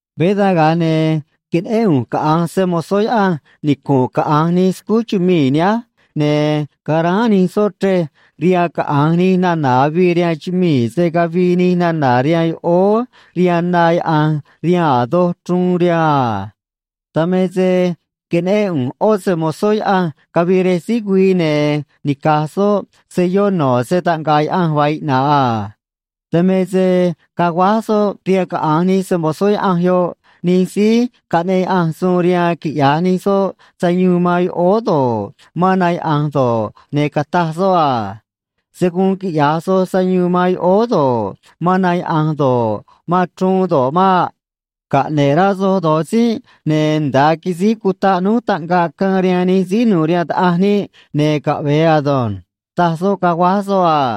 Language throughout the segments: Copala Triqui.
Veé dan, ga̱a ne̱ queneꞌén ꞌu̱nj caꞌa̱nj se‑mo̱zó Yaꞌanj nicu̱nꞌ caꞌa̱nj nij scúj chumii̱ nihánj, ne̱ caráán nij soꞌ chrej rihaan caꞌa̱nj nij nana̱ avii rihaan chumii̱, se̱ cavii nij nana̱ rihaan yoꞌóó rihaan na yaꞌa̱nj rihaan a̱ doj chruun rihaan a. Dan me se queneꞌén ꞌu̱nj ꞌó se‑mo̱zó Yaꞌanj cavii rej síj güii, ne̱ nica̱j soꞌ selló no̱ se‑taꞌnga̱ꞌ Yaꞌanj vaa iꞌna̱ꞌ a. Dan me se caguáj soꞌ rihaan caꞌa̱nj nij se‑mo̱zó Yaꞌanj yoꞌ nij síí caꞌneꞌ Yaꞌanj suun rihaan quiꞌya̱j nij soꞌ sayuun man yoꞌóó do̱ꞌ, man na yaꞌa̱nj do̱ꞌ, ne̱ cataj soꞌ a: ―Se̱ guun quiꞌya̱j soj sayuun man yoꞌóó do̱ꞌ, man na yaꞌa̱nj do̱ꞌ, man chruun do̱ꞌ maꞌ. Caꞌne̱ꞌ rá soj do̱j tzínꞌ, ne̱ nda̱a quisíj cutaꞌ núj taꞌngaꞌ caan rihaan nij síí nu̱u̱ rihaan Taꞌanj níꞌ, ne̱ caꞌve̱e ado̱nj ―taj soꞌ, caguáj soꞌ a.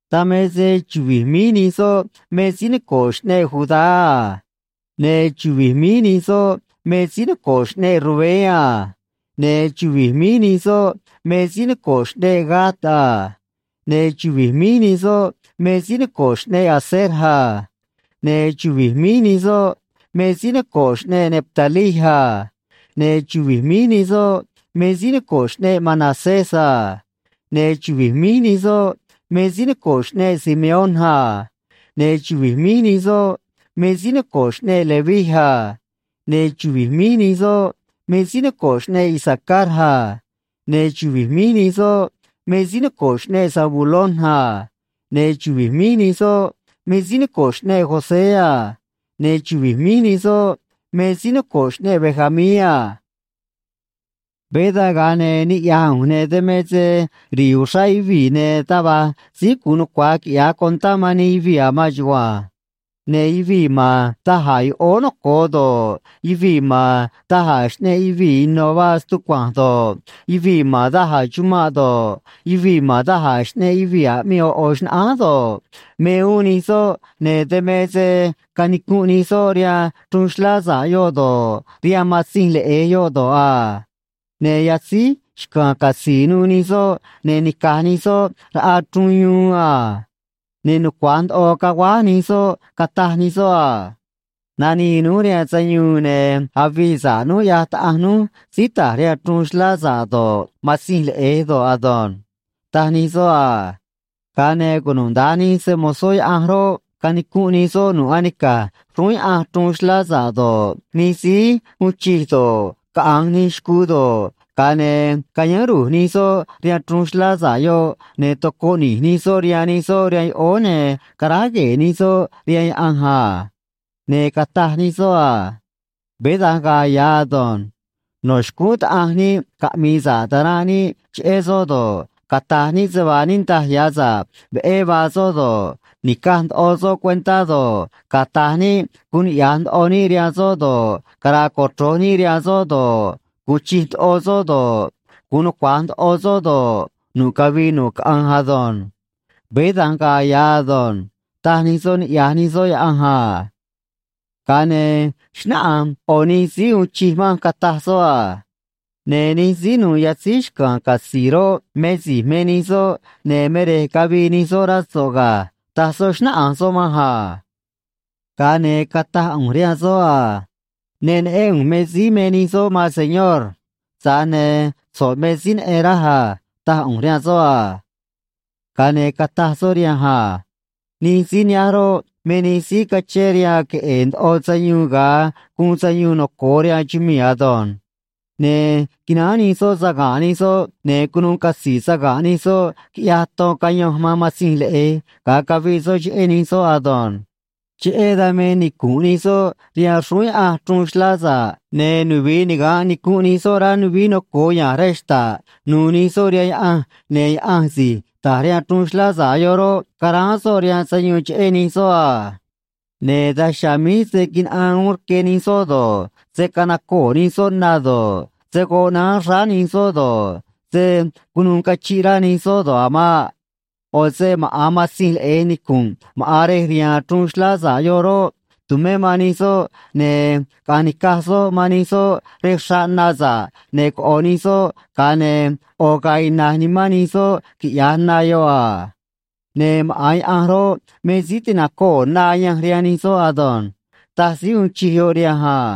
Dan me se chuvi̱j míj nij soꞌ me síí noco̱ꞌ xꞌneꞌ Judá a. Ne̱ chuvi̱j míj nij soꞌ me síí noco̱ꞌ xꞌneꞌ Rubén a. Ne̱ chuvi̱j míj nij soꞌ me síí noco̱ꞌ xꞌneꞌ Gad a. Ne̱ chuvi̱j míj nij soꞌ me síí noco̱ꞌ xꞌneꞌ Aser a. Ne̱ chuvi̱j míj nij soꞌ me síí noco̱ꞌ xꞌneꞌ Neftalí a. Ne̱ chuvi̱j míj nij soꞌ me síí noco̱ꞌ xꞌneꞌ Manasés a. Ne̱ chuvi̱j míj nij soꞌ me síí noco̱ꞌ xꞌneꞌ Simeón a. Ne̱ chuvi̱j míj nij soꞌ me síí noco̱ꞌ xꞌneꞌ Leví a. Ne̱ chuvi̱j míj nij soꞌ me síí noco̱ꞌ xꞌneꞌ Isacar a. Ne̱ chuvi̱j míj nij soꞌ me síí noco̱ꞌ xꞌneꞌ Zabulón a. Ne̱ chuvi̱j míj nij soꞌ me síí noco̱ꞌ xꞌneꞌ José a. Ne̱ chuvi̱j míj nij soꞌ me síí noco̱ꞌ xꞌneꞌ Benjamín a. Veé dan, ga̱a ne̱ niꞌya̱j ꞌu̱nj, ne̱ dan me se ri̱i̱ uxrá yuvii̱, ne̱ taj va̱j síí gu̱un nucua̱j quiꞌya̱j contá man nij yuvii̱ a̱ maan chugua̱nj. Ne̱ yuvii̱ ma̱n da̱j a̱ yoꞌóó noco̱o do̱ꞌ, yuvii̱ ma̱n da̱j a̱ xꞌneꞌ yuvii̱ ino̱ vaa stucua̱nj do̱ꞌ, yuvii̱ ma̱n da̱j a̱ chumanꞌ do̱ꞌ, yuvii̱ ma̱n da̱j a̱ xꞌneꞌ yuvii̱ aꞌmii ꞌo̱ ꞌo̱ xnaꞌánj do̱ꞌ, me uún nij soꞌ, ne̱ dan me se canicunꞌ nij soꞌ rihaan chruun xlá sa̱ꞌ yoꞌ do̱ꞌ, rihaan Matzinj Leꞌe̱j yoꞌ do̱ꞌ a. Ne̱ yatzíj xca̱a̱n catzi̱i̱ nuû nij soꞌ, ne̱ nica̱j nij soꞌ raꞌa chruun yuun a. Ne̱ nucua̱j ndoꞌo caguáj nij soꞌ, cataj nij soꞌ a: Nanii núj rihaan sayuun ne̱ avii sa̱ꞌ núj, ꞌyaj Taꞌanj núj síí ta̱j rihaan chruun xlá sa̱ꞌ do̱ꞌ, Matzinj Leꞌe̱j do̱ꞌ ado̱nj, taj nij soꞌ a. Ga̱a ne̱ cunuda̱nj nij se‑mo̱zó Yaꞌanj roꞌ, canicunꞌ nij soꞌ nu̱ꞌ anica̱j xrúún Yaꞌanj chruun xlá sa̱ꞌ do̱ꞌ, nij síí uun chij do̱ꞌ, caꞌa̱nj nij xcuu do̱ꞌ, ga̱a ne̱ cayáán ru̱j nij soꞌ rihaan chruun xlá sa̱ꞌ yoꞌ, ne̱ tocoꞌ ni̱j nij soꞌ rihaan nij soꞌ rihaan yoꞌóó, ne̱ caráj gue̱e̱ nij soꞌ rihaan Yaꞌanj a. Ne̱ cataj nij soꞌ a: Veé da̱nj ga̱a̱ ya̱ ado̱nj. No̱ xcúún Taꞌanj níꞌ caꞌmi̱i̱ sa̱ꞌ ta̱ranꞌ níꞌ cheꞌé soꞌ do̱ꞌ, cata̱j níꞌ se vaa niꞌndaj ya̱ sa̱ꞌ veꞌé vaa soꞌ do̱ꞌ, ni̱caj ndoꞌo soꞌ cuentá do̱ꞌ, cata̱j níꞌ guun niꞌya̱j ndoꞌo níꞌ rihaan soꞌ do̱ꞌ, cara̱a̱ cochro̱j níꞌ rihaan soꞌ do̱ꞌ, gu̱un chij ndoꞌo soꞌ do̱ꞌ, gu̱un nucua̱j ndoꞌo soꞌ do̱ꞌ, nu̱ꞌ cavii nu̱ꞌ caꞌanj ado̱nj. Veé da̱nj ga̱a̱ ya̱ ado̱nj, taj nij soꞌ niꞌya̱j nij soꞌ Yaꞌanj a. Ga̱a ne̱ xnáꞌanj ꞌo̱ nij síí uun chij manj, cataj soꞌ a: ―Ne̱ nij síí nu̱u̱ yatzíj xca̱a̱n catzi̱i̱ roꞌ, me si̱j me nij soꞌ, ne̱ me rej cavii nij soꞌ, rá so̱ꞌ ga̱ ―taj soꞌ, xnáꞌanj soꞌ manj a. Ga̱a ne̱ cataj ꞌu̱nj rihaan soꞌ a: ―Ne neꞌén ꞌu̱nj me síí me nij soꞌ, maan señor. Tza̱j ne̱ so̱ꞌ me síí neꞌen, raj a ―taj ꞌu̱nj rihaan soꞌ a. Ga̱a ne̱ cataj soꞌ rihanj a: ―Nij síí nihánj roꞌ, me nij síí cachén rihaan queꞌe̱e̱ ndoꞌo sayuun, ga̱a guun sayuun noco̱o rihaan chumii̱ ado̱nj. Ne̱ quináán nij soꞌ saga̱nꞌ nij soꞌ, ne̱ cunuu catzi̱i̱ saga̱nꞌ nij soꞌ, quiꞌyaj ton cayanj man Matzinj Leꞌe̱j ga̱a caviꞌ soꞌ cheꞌé nij soꞌ ado̱nj. Cheꞌé dan me nicu̱nꞌ nij soꞌ rihaan xrúún Yaꞌanj chruun xlá sa̱ꞌ, ne̱ nuvi̱i niga̱nꞌ nicunꞌ nij soꞌ rá nuvií noco̱o ya̱nj rej xta̱ꞌ nu̱u̱ nij soꞌ rihaan Yaꞌanj, ne̱ Yaꞌanj si̱j ta̱j rihaan chruun xlá sa̱ꞌ yoꞌ roꞌ, ca̱ráán soꞌ rihaan sayuun cheꞌé nij soꞌ a. Ne̱ daj chiha̱a̱ míj se̱ quinaꞌaan uún rque nij soꞌ do̱ꞌ, se̱ canacoo̱ nij soꞌ na do̱ꞌ, se̱ goꞌ naán xráá nij soꞌ do̱ꞌ, se̱ cunuû cachiꞌ rá nij soꞌ do̱ꞌ a̱ maꞌ. ꞌO̱ se maꞌa̱n Matzinj Leꞌe̱j nicu̱nꞌ maꞌa̱n rej rihaan chruun xlá sa̱ꞌ yoꞌ roꞌ, tu̱mé man nij soꞌ, ne̱ caꞌa̱nj ni̱caj soꞌ man nij soꞌ rej xraꞌ na sa̱ꞌ, ne̱ coꞌo̱ nij soꞌ, ga̱a ne̱ ꞌo̱ ga̱a̱ iꞌna̱ꞌ nimán nij soꞌ, quiꞌya̱j na yoꞌ a. Ne̱ maꞌa̱n Yaꞌanj roꞌ, me síí ti̱nacoo̱ na ayanj rihaan nij soꞌ ado̱nj ―taj síí uun chij yoꞌ rihanj a.